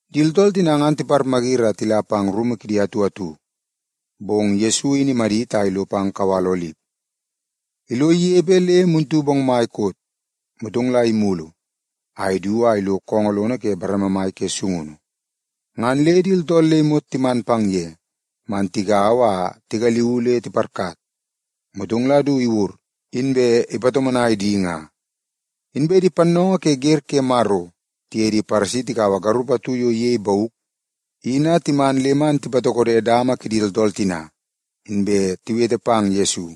Di tooltool tina ngan timayiri a tila pang rumu kidi atu atu, bong Yesu in imadit a ilo pang kawal Olip. Ilo inepe le muntu bongmai koot, motong la imulu a idu a ilo koongoo lono ke bareme mai ke sungunu. Ngan le di tooltool le imot timan pang ye man tigaua a tigaliuu le tiparkat, motong la du iwur, inbe ipatomonai di nga. Inbe di pannoongoo ke wer ke Maro tiye di Paresi tikaua garup atu yo iyei bauk, in a timan le man tipatokode dama kidi tooltool tina, inbe tiwete pang Yesu.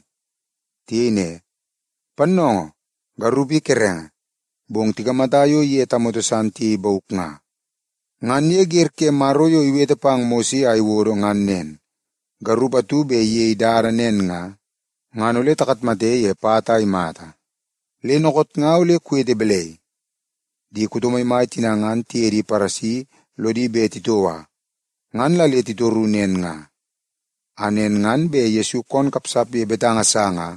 Tiyei ne, “Pannoongoo, garup i kerenge, bong tikamata yo iye tamoto san tiyei bauk nga. Ngan ye wer ke Maro yo iwete pang Mose a iwodo ngan nen, garup atu bet iyei dada nen nga, ngan ole takatmate ye pat a imata. Le dookoot nga ole kuwete balai?” Di kuto maimai tina ngan tiye di Paresi lodi bet titoua. Ngan la le titoru nen nga, a nen ngan bet Yesu koon kapsap ye betanga sa nga,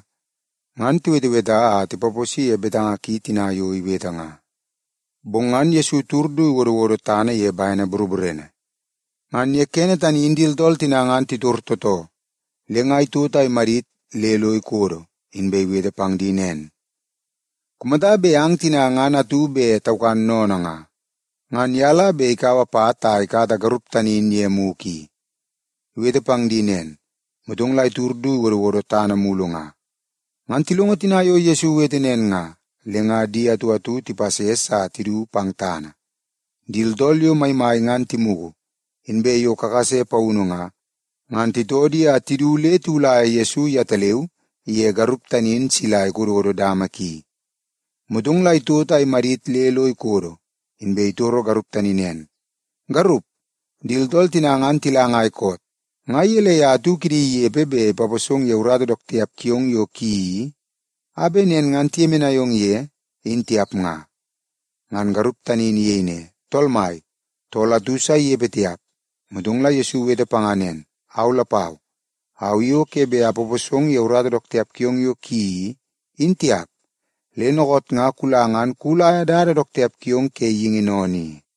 ngan tiweteweta a tipaposi ye betanga ki tina yo iwete nga. Bong ngan Yesu itud du iwodowodo tana ye bene boroborene. Ngan ye kene tani in di tooltool tina ngan titor tootoo, le nga itot a imadit le lo ikodo, inbe iwete pang di nen, “Kumata bet ang tina ngan atu bet taukan sennene nga, ngan ye la bet ikaua pat a ikata garup tani in ye mugu i.” Iwete pang di nen, motong la itud du iwodowodo tana mulu nga. Ngan tilongo tina yo Yesu iwete nen nga, le nga di atu atu tipases a tidu pang tana. Di tooltool yo maimai ngan timugu, inbe yo kakase paunu nga, ngan titoo di a tidu le tiwulaia Yesu yetaleu iye garup tani in sila ikododo dama ki. Motong la itot a imadit le lo ikodo, inbe itoro garup tani nen, “Garup, di tooltool tina ngan tila ngai koot? Nga gelei a atu kidi inepe bet ipaposong ye urata dook tiap kiong yo kuyeii i, a bet nen ngan tiyemenai ong ye, in tiap nga?” Ngan garup tani in iyei ne, “Tool mai, tool atu sa yo inepe, ngan tiap.” Motong la Yesu iwete panga nen, “Au lapau, au i o ke bet apaposong ye urata dook tiap kiong yo kuyeii i, in tiap. Le dookoot nga kula ngan kuwulaia dada dook tiap kiong ke geingi sennene i.”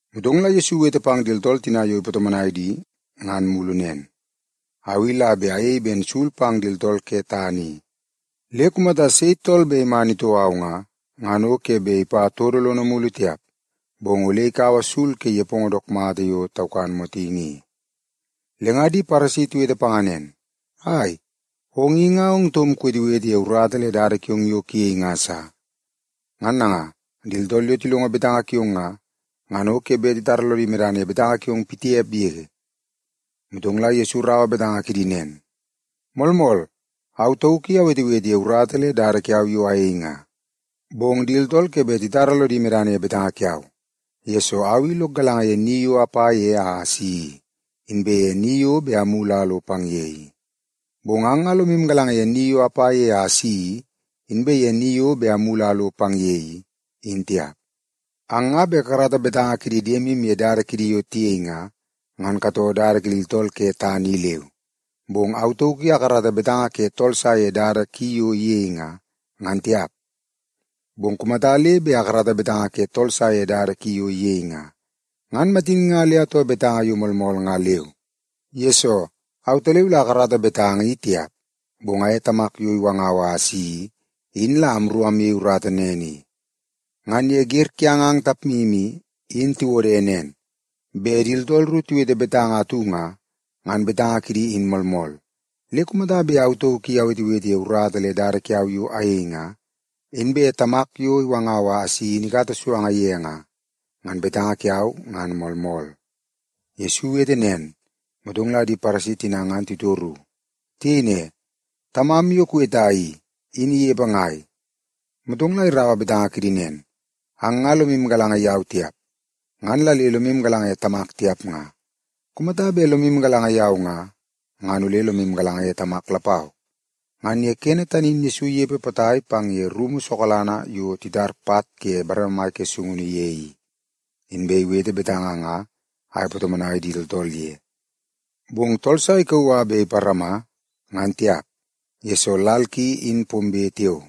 Motong la Yesu iwete pang di tooltool tina yo ipatomonai di ngan mulu nen, “Au i la bet ayei ben sul pang di tooltool ke tana i. Le kumata sei tool bet iman itoo au nga, ngan o ke bet ipa todo lono mulu tiap, bong ole ikaua sul ke nepongo dook mata yo taukan motingi i.” Le nga di Paresi tiwete panga nen, “Ai, ong i nga ong taum kuwetewete ye urata le dada kiong yo kuyei nga sa. Ngan nanga, di tooltool yo tilongo betanga kiong nga, ngan o ke bet titara lodi medana ye betanga kiong pitiap yege.” Motong la Yesu iraua betanga kidi nen, “Moolmool, au tauk i awetewete ye urata le dada kiau yo ayei nga, bong di tooltool ke bet titara lodi medana ye betanga kiau, yesoo au i lok galanga ye ni yo apa ye a asi i, inbe ye ni yo bet amulu a alo pang ye i. Bong ang nga lomu galanga ye ni yo apa ye a asi i, inbe ye ni yo bet amulu a alo pang ye i, in tiap. Ang nga bet kakarata betanga kidi diemu ye dada kidi yo tiyei nga, ngan katoo dada kidi tooltool ke tana i leu. Bong au tauk i akarata betanga ke tool sa ye dada ki yo iyei nga, ngan tiap. Bong kumata le bet akarata betanga ke tool sa ye dada ki yo iyei nga, ngan matin nga le atoo betanga yo moolmool nga leu. Yesoo, autaleu la akarata betanga, i tiap, bong aye Tamak yo iwangau a asi i, in la amru amyei urata nen i. Ngan ye wer kiang ang tapmu i, in tiwode nen, bet di tooltool ru tiwete betanga atu nga, ngan betanga kidi in moolmool. Le kumata bet au tauk i awetewete ye urata le dada kiau yo ayei nga, inbe Tamak yo iwangau a asi in ikata suanga ye nga, ngan betanga kiau ngan moolmool.” Yesu iwete nen, motong la di Paresi tina ngan titoru. Tiyei ne, “Tamam yo kuweta i, in inepe ngai?” Motong la iraua betanga kidi nen, “Ang nga lomu galanga yau tiap, ngan la le lomu galanga ye Tamak tiap nga. Kumata bet lomu galanga yau nga, ngan ole lomu galanga ye Tamak lapau.” Ngan ye kene tani in Yesu inepe potai pang ye rumu lono sokalanga yo titar pat ke bareme mai ke sungunu ye i, inbe iwete betanga nga a ipatomonai di tooltool ye. Bong tool sa ikauu a bet iparama ngan tiap, yesoo lal ki, in pombe tiao.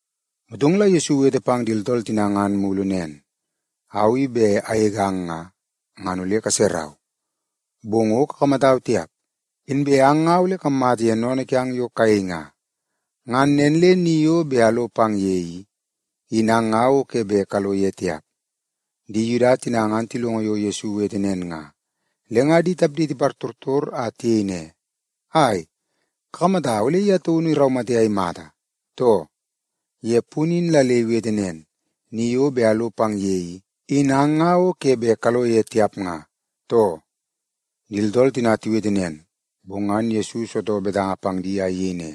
Motong la Yesu iwete pang di tooltool tina ngan mulu nen, “Au i bet agegang nga, ngan ole kaserau, bong o kakamatau tiap. Inbe ang nga ole kammata ye sennene kiang yo kayei nga. Ngan nen le ni yo bet alo pang ye i, in ang nga o ke bet kalo ye tiap.” Di Yuda tina ngan tilongo yo Yesu iwete nen nga, le nga di tapdi tipartortor a tiyei ne, “Ai, kakamata ole ye taun iraumate a imata, too? Ye punu in la le iwete nen, ‘Ni yo bet alo pang ye i, in ang nga o ke bet kalo ye tiap’ nga, too.” Di tooltool tina tiwete nen, bong ngan Yesu isitoo betanga pang di a iyei ne,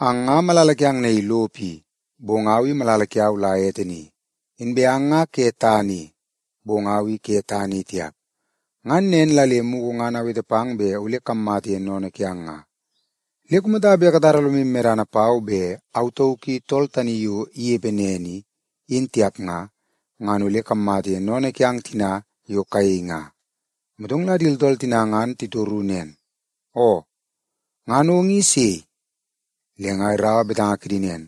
“Ang nga malala kiang naii lopo i, bong au i malala kiau la ete ni. Inbe ang nga ke tana i, bong au i ke tana i tiap. Ngan nen la le mugu ngan awete pang bet ole kammata ye sennene kiang nga. Le kumata bet katara lomu medana pau bet Au Tauk I Tool Tani Yo Inepe Nen I, in tiap nga, ngan ole kammata ye sennene kiang tina yo kayei nga.” Motong la di tooltool tina ngan titoru nen, “Oo, ngan ong i sei?” Le nga iraua betanga kidi nen,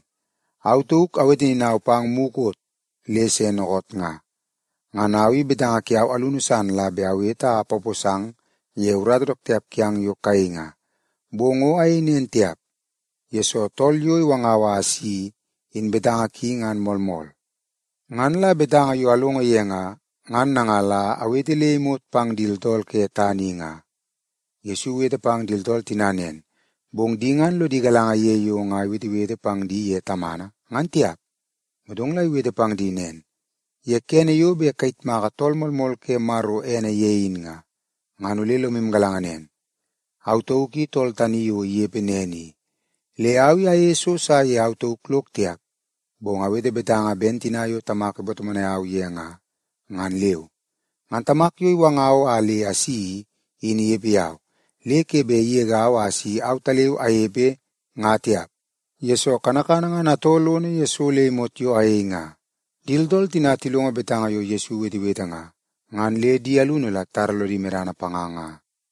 “Au tauk awete ninau pang mukot le se dookoot nga. Ngan au i betanga kiau alunu san la bet awete a apaposang ye urata dook tiap kiang yo kayei nga. Bong o ayei nen tiap, yesoo Tool yo iwangau a asi i, in betanga ki ngan moolmool. Ngan la betanga yo alongo ye nga, ngan nanga la awete le imot pang di tooltool ke tana i nga.” Yesu iwete pang di tooltool tina nen, bong di ngan lodi galanga ye yo nga iwetewete pang di ye Tamana, ngan tiap. Motong la iwete pang di nen, “Ye kene yo bet kayitmaka Tool Moolmool ke Maro ene ye in nga, ngan ole lomu galanga nen, Au Tauk I Tool Tani Yo Inepe Nen I. Le au i ayeie so sa ye au tauk lok tiap, bong awete betanga ben tina yo Tamak ipatomonai au ye nga, ngan leu. Ngan Tamak yo iwangau a le asi i, in inepe yau. Le ke bet igegau a si autaleu anepe nga tiap, yesoo kanakana ngan atoo lono ye so le imot yo ayei nga.” Di tooltool tina tilongo betanga yo Yesu iwetewete nga, ngan le di alunu la titara lodi medana panga nga.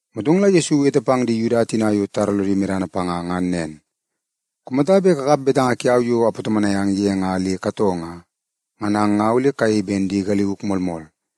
Motong la Yesu iwete pang di Yuda tina yo titara lodi medana panga ngan nen, “Kumata bet kakap betanga kiau yo apatomonai ang ye nga le katoo nga, ngan ang nga ole kayei ben di galiuk moolmool.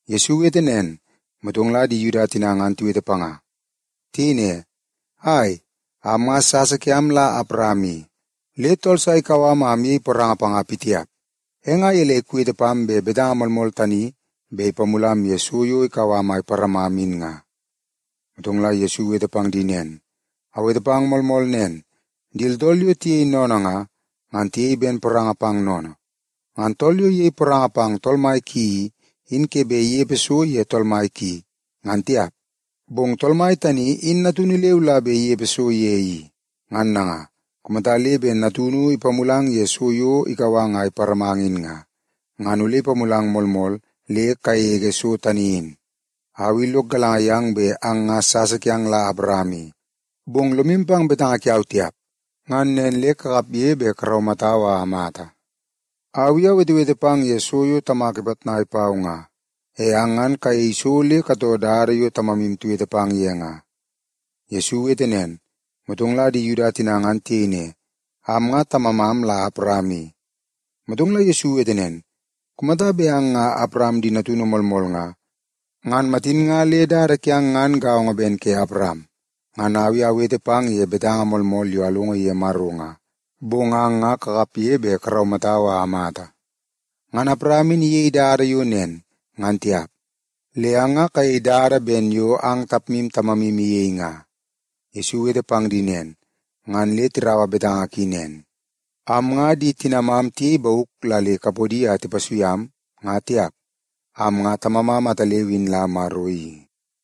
Yesu iwete nen, motong la di Yuda tina ngan tiwete panga. Tiyei ne, “Ai, am nga sasa kiam la Awaram i, le tool sa ikau am a amyei poranga panga pitiap. E nga gelei kuwete pam bet betanga moolmool tani bet ipamulam ye so yo bet ikau am a iparamam in nga?” Motong la Yesu iwete pang di nen, “Awete pang moolmool nen, di tooltool yo tiyei sennene nga, ngan tiyei ben poranga pang sennene. Ngan tool yo iyei poranga pang tool mai ki i, in ke bet inepe so ye tool mai ki, ngan tiap, bong tool mai tani in natunu leu la bet inepe so ye i. Ngan nanga, kumata le bet Natunu ipamulang ye so yo bet ikau ang a iparamang in nga, ngan ole ipamulang moolmool le kagege so tani in. Au i lok galanga yang bet ang nga sasa kiang la Awaram i. Bong lomu pang betanga kiau tiap, ngan nen le kakapge bet karaumatau a amata. Au i awetewete pang ye so yo Tamak ipitnai pau nga. E ang ngan kayei so le katoo dada yo tamamu iwete pang ye nga.” Yesu iwete nen, motong la di Yuda tina ngan tiyei ne, “Am nga tamamam la Awaram i.” Motong la Yesu iwete nen, “Kumata bet ang nga Awaram di natunu moolmool nga, ngan matin nga le dada kiang ngan gaongo ben ke Awaram. Ngan au i awete pang ye betanga moolmool yo alongo ye Maro nga. Bong ang nga kakapge bet karaumatau a amata. Ngan Awaram in iyei dada yo nen, ngan tiap. Le ang nga kayei dada ben yo ang tapmu tamamu iyei nga.” Yesu iwete pang di nen, ngan le tiraua betanga ki nen, “Am nga di tinamam tiyei bauk la le kapodi a tipasui am, nga tiap. Am nga Tamamam ataleu in la Maro i.”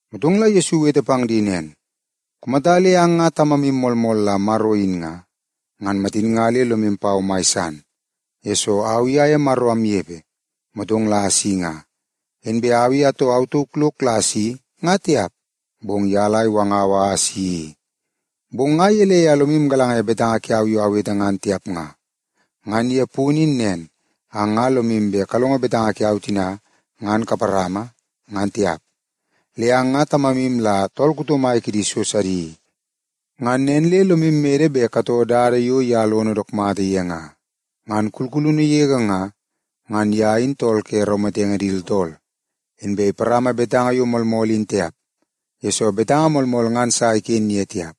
Motong la Yesu iwete pang di nen, “Kumata le ang nga Tamamu moolmool la Maro in nga, ngan matin nga le lomu pau mai san, yesoo au i aye Maro amnepe, motong la asi nga. Inbe au i atoo au tauk lok la asi, nga tiap, bong ye la iwangau a asi i. Bong nga gelei a lomu galanga ye betanga kiau yo awete ngan tiap nga? Ngan ye punu in nen, ang nga lomu bet kalongo betanga kiau tina ngan kaparama, ngan tiap. Le ang nga tamamu la tool kuto mai kidi so sidi i. Ngan nen le lomu mede bet katoo dada yo ye lon dook mata ye nga. Ngan kulkulunu yege nga, ngan ye in tool ke raumatenge di tooltool. Inbe iparama betanga yo moolmool in tiap, yesoo betanga moolmool ngan sa iken ye tiap.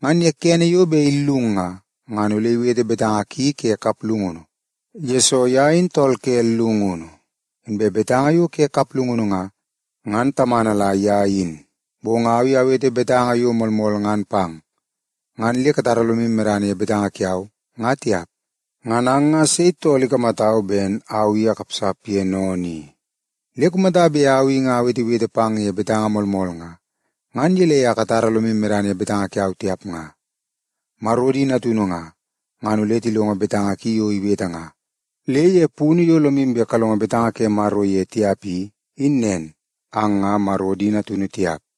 Ngan ye kene yo bet illung nga, ngan ole iwete betanga ki ke kaplungunu, yesoo ye in tool ke llungunu, inbe betanga yo ke kaplungunu nga, ngan tamana la ye in. Bong au i awete betanga yo moolmool ngan pang, ngan le katara lomu medana ye betanga kiau, nga tiap. Ngan ang nga sei tool ikamatau ben au i akapsap ye sennene i? Le kumata bet au i nga awetewete pang ye betanga moolmool nga, ngan gelei a katara lomu medana ye betanga kiau tiap nga? Maro di natunu nga, ngan ole tilongo betanga ki yo iwete nga. Le ye punu yo lomu bet kalongo betanga ke Maro ye tiap i, in nen, ang nga Maro di natunu tiap.”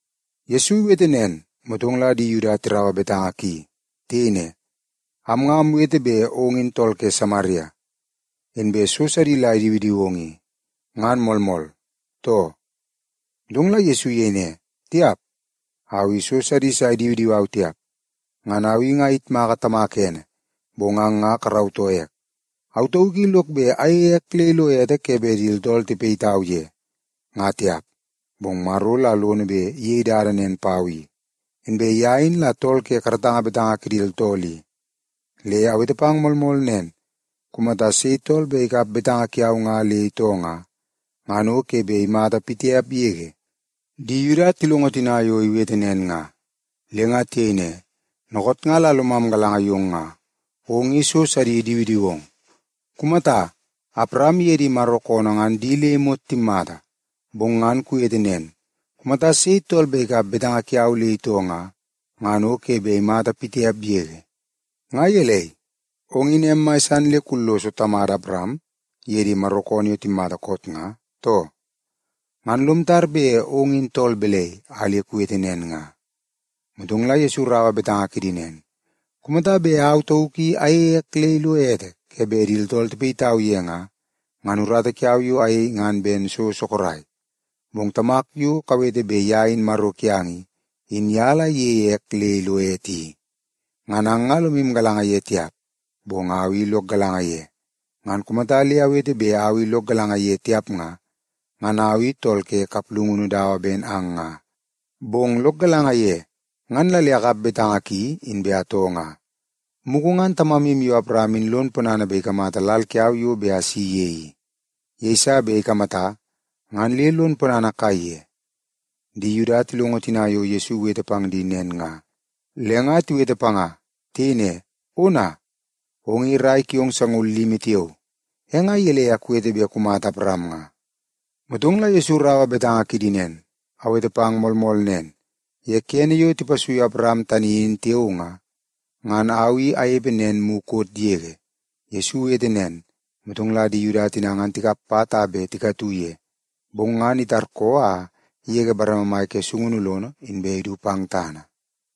Yesu iwete nen, motong la di Yuda tiraua betanga ki. Tiyei ne, “Am nga amwete bet ong in tool ke Samaria, inbe so sidi la idiwidiwong i. Ngan moolmool, too?” Motong la Yesu iyei ne, “Tiap! Au i so sidi sa idiwidiwau tiap. Ngan au i nga ayitmaka Tamak ene, bong ang nga karautoo ek. Au tauk i lok bet ayeie ek le ilo ete ke bet di tooltool tipayitau ye, nga tiap, bong Maro la lono bet iyei dada nen pau i. Inbe ye in la tool ke karatanga betanga kidi tooltool i. Le awete pang moolmool nen, kumata sei tool bet ikap betanga kiau nga le itoo nga, ngan o ke bet imata pitiap yege.” Di Yuda tilongo tina yo iwete nen nga, le nga tiyei ne, “Dookoot nga la lomam galanga yong nga, ong i so sidi idiwidiwong. Kumata, Awaram iye di Maro koonoo ngan di le imot timmata. Bong ngan kuwete nen, ‘Kumata sei tool bet ikap betanga kiau le itoo nga, ngan o ke bet imata pitiap yege.’ Nga gelei, ong in em mai le kulloso tamada Awaram iye di Maro koonoo yo timmata koot nga, too? Ngan lom tar bet ong in tool balai a le kuwete nen nga?” Motong la Yesu iraua betanga kidi nen, “Kumata bet au tauk i ayeie ek le ilo ete ke bet di tooltool tipayitau ye nga, ngan urata kiau yo ayei ngan ben so sorok. Bong Tamak yo kawete bet ye in Maro kiang i, in ye la iyeie ek le ilo ete i. Ngan ang nga lomu galanga ye tiap, bong au i lok galanga ye. Ngan kumata le awete bet au i lok galanga ye tiap nga, ngan au i tool ke kaplungunu dawa ben ang nga. Bong lok galanga ye, ngan la le akap betanga ki inbe atoo nga. Mugu ngan tamamu yo Awaram in lon ponana bet ikamata lal kiau yo bet asi ye i. Yeiso bet ikamata, ngan le lon ponana kaiye.” Di Yuda tilongo tina yo Yesu iwete pang di nen nga, le nga tiwete panga. Tiyei ne, “Ona, ong i rai kiong sangaul limi tiao, e nga gelei a kuwete bet kumata Awaram nga?” Motong la Yesu iraua betanga kidi nen, “Awete pang moolmool nen, ye kene yo tipasuiu Awaram tani in tiao nga, ngan Au I Anepe Nen mukot yege.” Yesu iwete nen, motong la di Yuda tina tikap pat a bet tikatu ye, bong ngan itarkoo a igege bareme mai ke sungunu lono inbe idu pang tana.